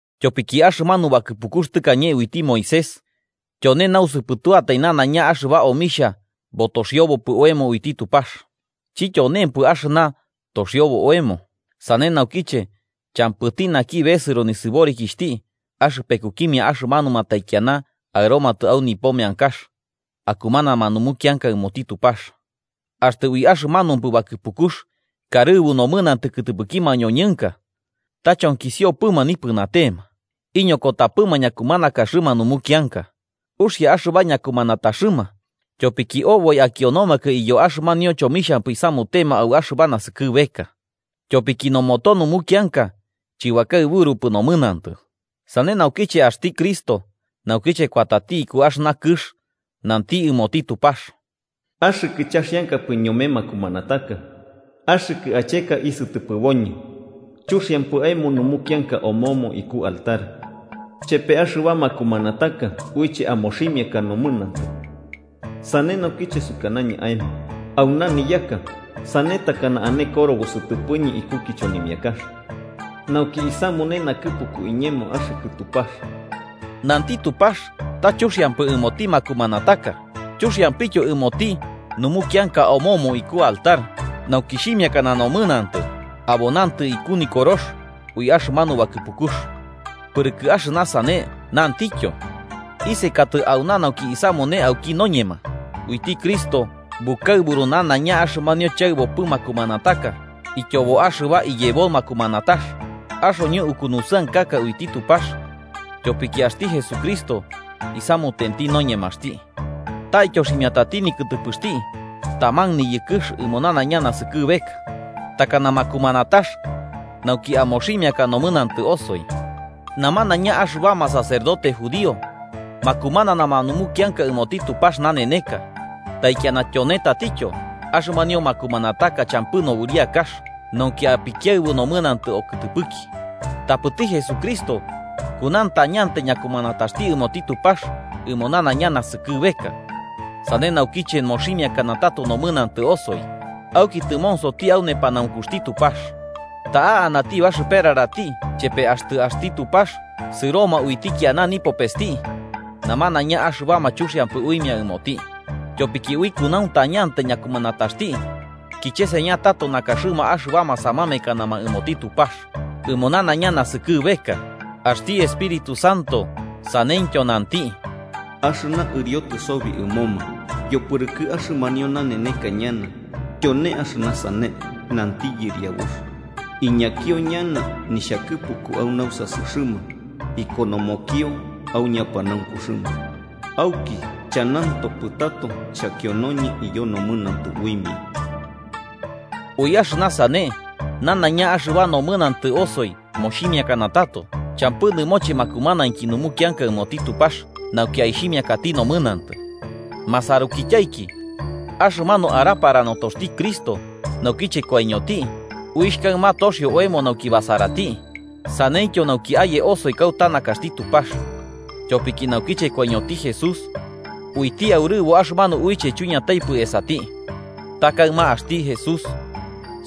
Tyopiki axɨmanu bakɨpukux tɨkañe uiti Moisés, tyone ta nausɨpɨtuatai nanaiña axɨba omixha botoxiobopɨ oemo uiti Tupax, chityonempɨ axɨna toxiobo oemo. Sane naukiche, champɨti naki besɨro nisɨborikixhti axɨpekukimia axɨmanuma taikiana aɨromatɨ au nipo meankax akumanama numukianka ɨmoti Tupax. Axtɨ ui axɨmanupɨ bakɨpukux karɨbu nomɨnantɨ kɨtɨpɨki mañoñɨnka, ta chonkisiopɨma nipɨnatema, iñokotapɨma ñakumanakaxɨma numukianka. Uxia axɨba ñakumanataxɨma tyopiki oboi akionomakɨ iyo axɨmanio chomixhampɨ isamutema au axɨba naskɨbeka. Tyopiki noboto numukianka chɨbakaɨburupɨ nomɨnantɨ. Sane naukiche axti Cristo, naukiche kuatati iku axɨna kɨx nanti ɨmoti Tupax: “Axɨkɨ chaxiankapɨ ñome makumanataka, axɨkɨ acheka isɨtɨpɨboñɨ. Chuxiampɨ aemo numukianka omomo iku altar, chepe axɨba makumanataka uiche amoximiaka nomɨnantɨ. Sane naukiche sukanañɨ aemo: ‘Auna niyaka, sane takana ane korobo sɨtɨpɨñɨ iku kichonimiakax, nauki isamune nakɨpuku iñemo, axɨkɨ Tupax.’” Nanti Tupax ta chuxiampɨ ɨmoti makumanataka chuxiampityo ɨmoti numukianka omomo iku altar, nauki xhimiakana nomɨnantɨ, abo nantɨ iku nikorox ui axɨmanu bakɨpukux. Pɨrɨkɨ axɨna sane nantityo: “Isekatɨ auna nauki isamune auki noñema.” Uiti Cristo bukaɨburu nanaiña axɨmanio chaɨbopɨ makumanataka ityobo axɨba iyebo makumanatax. Axoñɨ ukunusɨankaka uiti Tupax tyopiki axti Jesucristo isamutenti noñemaxti. Ta ityoximiatati nikɨtɨpɨxti taman niyɨkɨx ɨmo nanaiña naskɨbeka, takana makumanatax nauki amoximiaka nomɨnantɨ osoi. Namanaiña axɨbama sacerdote judío makumananama numukianka ɨmoti Tupax naneneka taikiana tyone tatityo, axɨmanio makumanataka champɨ nobɨriakax nauki apikiaɨbu nomɨnantɨ okɨtɨpɨki. Tapɨti Jesucristo kunauntañantai ñakumanataxti ɨmoti Tupax ɨmo nanaiña naskɨbeka, sane naukiche moximiakana tato nomɨnantɨ osoi. Auki tɨmonsoti au nepanaunkuxti Tupax. Ta'a anati baxɨperarati chepe axtɨ axti Tupax sɨroma uiti ñokiana nipopesti namanaiña axɨbama chuxiampɨ uimia ɨmoti, tyopiki ui kunauntañantai ñakumanataxti kicheseña tato nakaxɨma axɨbama samamekanama ɨmoti Tupax ɨmo nanaiña naskɨbeka. Axti Espíritu Santo saneityo nanti: “Axɨna ɨriotɨ sobi ɨmoma yopɨrɨkɨ axɨmanio naneneka ñana, tyone axɨna sane, nanti Yɨriabux: Iñakio ñana nixhakɨpuku au nausasɨxɨma ikonomokio au ñapanaunkuxɨma. Auki chanantopɨ tato xhakionoñɨ iyo nomɨnantɨ uimia.” Ui axɨna sane, nanaiña axɨba nomɨnantɨ osoi moximiakana tato, champɨ nɨmoche makumanainki numukianka ɨmoti Tupax nauki aixhimiakati nomɨnantɨ. Masarukityaiki, axɨmanu arapara notoxti Cristo naukiche koiñoti uixh kaɨma toxio oemo nauki basarati saneityo nauki aye osoi kauta nakaxti Tupax. Tyopiki naukiche koiñoti Jesús, uiti aurɨbo axɨmanu uiche chuiñataipɨ esati. Ta kaɨma axti Jesús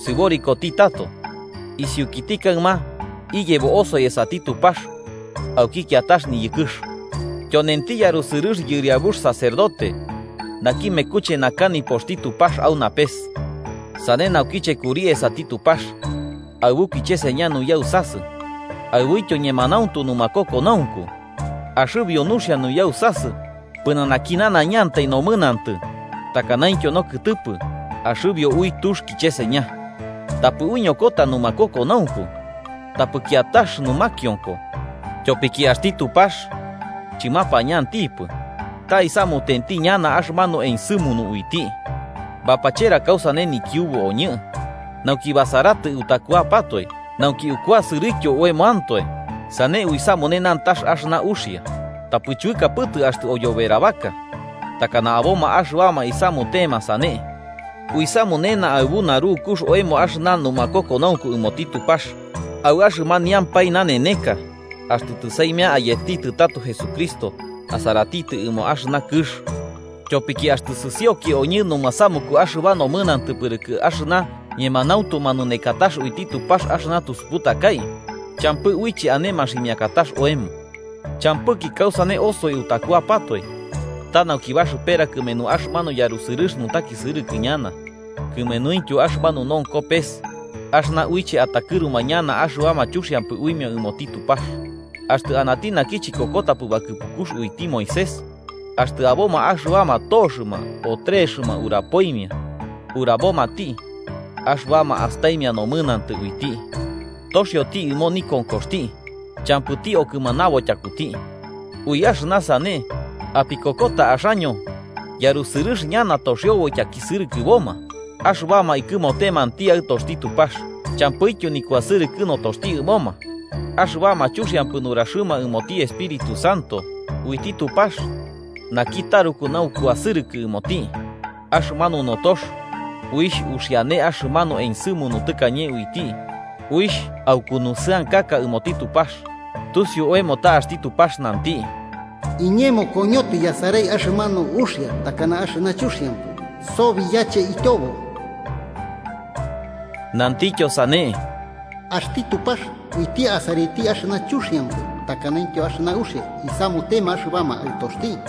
sɨborikoti tato, isiukiti kaɨma iyebo osoi esati Tupax auki kiatax niyɨkɨx. Tyonenti yarusɨrɨx yɨriabux sacerdote naki mekuche naka nipoxti Tupax au napes. Sane naukiche kuri esati Tupax aɨbu kicheseña nuyausasɨ aɨbuityo ñemanauntu numakokonaunku, axɨbio nuxia nuyausasɨ pɨnanaki nanaiñantai nomɨnantɨ takanaintyo nokɨtɨpɨ axɨbio ui tux kɨcheseña. Tapɨ uiñokota numakokonaunku, tapɨ kiatax numakionko tyopiki axti Tupax chɨmapañantipɨ ta isamutenti ñana axɨmanu ensɨmunu uiti. Bapachera kausane nikiubu oñɨ nauki basaratɨ utakuapatoe, nauki ukuasɨrɨtyo oemoantoe sane uisamune nantax axɨna uxia. Tapɨ chuɨkapɨtɨ axtɨ oyoberabaka, takana aboma axɨbama isamutema sane, uisamunena aɨbu narukux oemo axɨna numakokonaunku ɨmoti Tupax, au axɨmaniampae naneneka axtɨ tɨsaimia ayetitɨ tato Jesucristo asaraiti ɨmo axɨna kɨx. Tyopiki axtɨ sɨsioki oñɨ numasamuku axɨba nomɨnantɨ pɨrɨkɨ axɨna ñemanauntu manunekatax uiti Tupax axɨna tusuputakai, champɨ uiche ane maximiakatax oemo. Champɨki kausane osoi utakuapatoe ta nauki baxɨpera kɨmenu axɨmanu yarusɨrɨx nutakisɨrɨkɨ ñana kɨmenuintyo axɨmanu nonko pes axɨna uiche atakɨruma ñana axɨba chuxiampɨ uimia ɨmoti Tupax. Axtɨ anati naki chikokotapɨ bakɨpukux uiti Moisés, axtɨ aboma axɨbama toxɨma o trexɨma urabomati axɨbama astaimia nomɨnantɨ uiti, toxioti ɨmo nikonkoxti champɨti okɨmanabo tyakuti. Ui axɨna sane ¿apikokota axaño yarusɨrɨx ñana toxiobo ityakisɨrɨkɨboma axɨbama ikɨmotemanti Aɨtoxti Tupax champɨityo nikuasɨrɨkɨ notoxti ɨmoma, axɨbama chuxiampɨ nuraxɨma ɨmoti Espíritu Santo uiti Tupax naki taruku naukuasɨrɨkɨ ɨmoti? Axɨmanu notox uixh uxiane axɨmanu ensɨmunu tɨkañe uiti, uixh aukunusɨankaka ɨmoti Tupax. Tusiu oemo ta axti Tupax nanti: “Iñemo koñotɨ yasarai axɨmanu uxia takana axɨna chuxiampɨ. Sobi yache ityobo.” Nantityo sane: “Axti Tupax uiti asaraiti axɨna chuxiampɨ takanaintyo axɨna uxia isamutema axɨbama aɨtoxti.”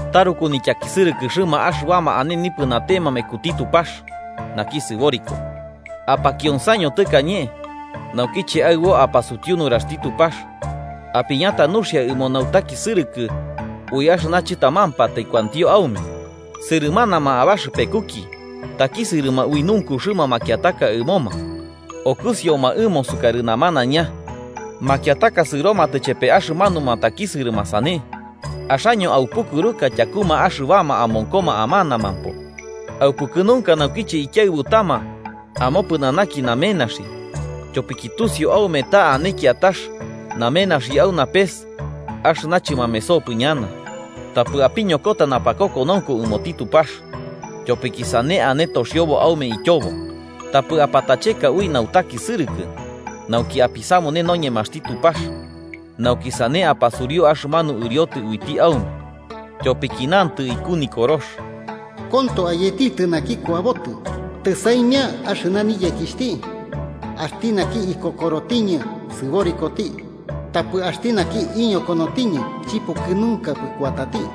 Taruku nityakisɨrɨkɨxɨma axɨbama ane nipɨnatema mekuti Tupax, naki sɨboriko. Apakionsaño tɨkañe, naukiche aɨbo apasutiu nuraxti Tupax apiñata nuxia ɨmo nautakisɨrɨkɨ ui axɨna chɨtamampatai kuantio aume. Sɨrɨmanama abaxɨpekuki takisɨrɨma ui nunkuxɨma makiataka ɨmoma, okɨsioma ɨmo sukarɨ namanaiña, makiataka sɨromatɨ chepe axɨmanuma takisɨrɨma sane. Axaño aupukɨruka tyakuma axɨbama amonkoma amanamampo, aupukɨnunka naukiche ikiaɨbutama amopɨnanaki namenaxi, tyopiki tusiu aume ta ane kiatax namenaxi au napes axɨna chɨmamesopɨ ñana. Tapɨ apiñokota napakokonaunku ɨmoti Tupax, tyopiki sane ane toxiobo aume ityobo. Tapɨ apatacheka ui nautakisɨrɨkɨ, nauki apisamune noñemaxti Tupax nauki sane apasuriu axɨmanu ɨriotɨ uiti aume. Tyopiki nantɨ iku Nikorox: “Konto, ayetitɨ naki kuabotɨ. tɨsaimia axɨna niyekixhti. Axti naki ikokorotiñɨ sɨborikoti. Tapɨ axtɨ iñokonotiñɨ, chipukɨnunkapɨ kuatati.”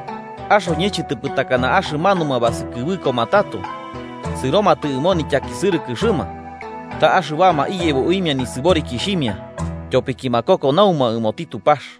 Axoñɨ chɨtɨpɨ takana axɨmanuma basɨkɨbɨkoma tato sɨromatɨ ɨmo nityakisɨrɨkɨxɨma, ta axɨbama iyebo uimia nisɨborikixhimia tyopiki makokonauma ɨmoti Tupax.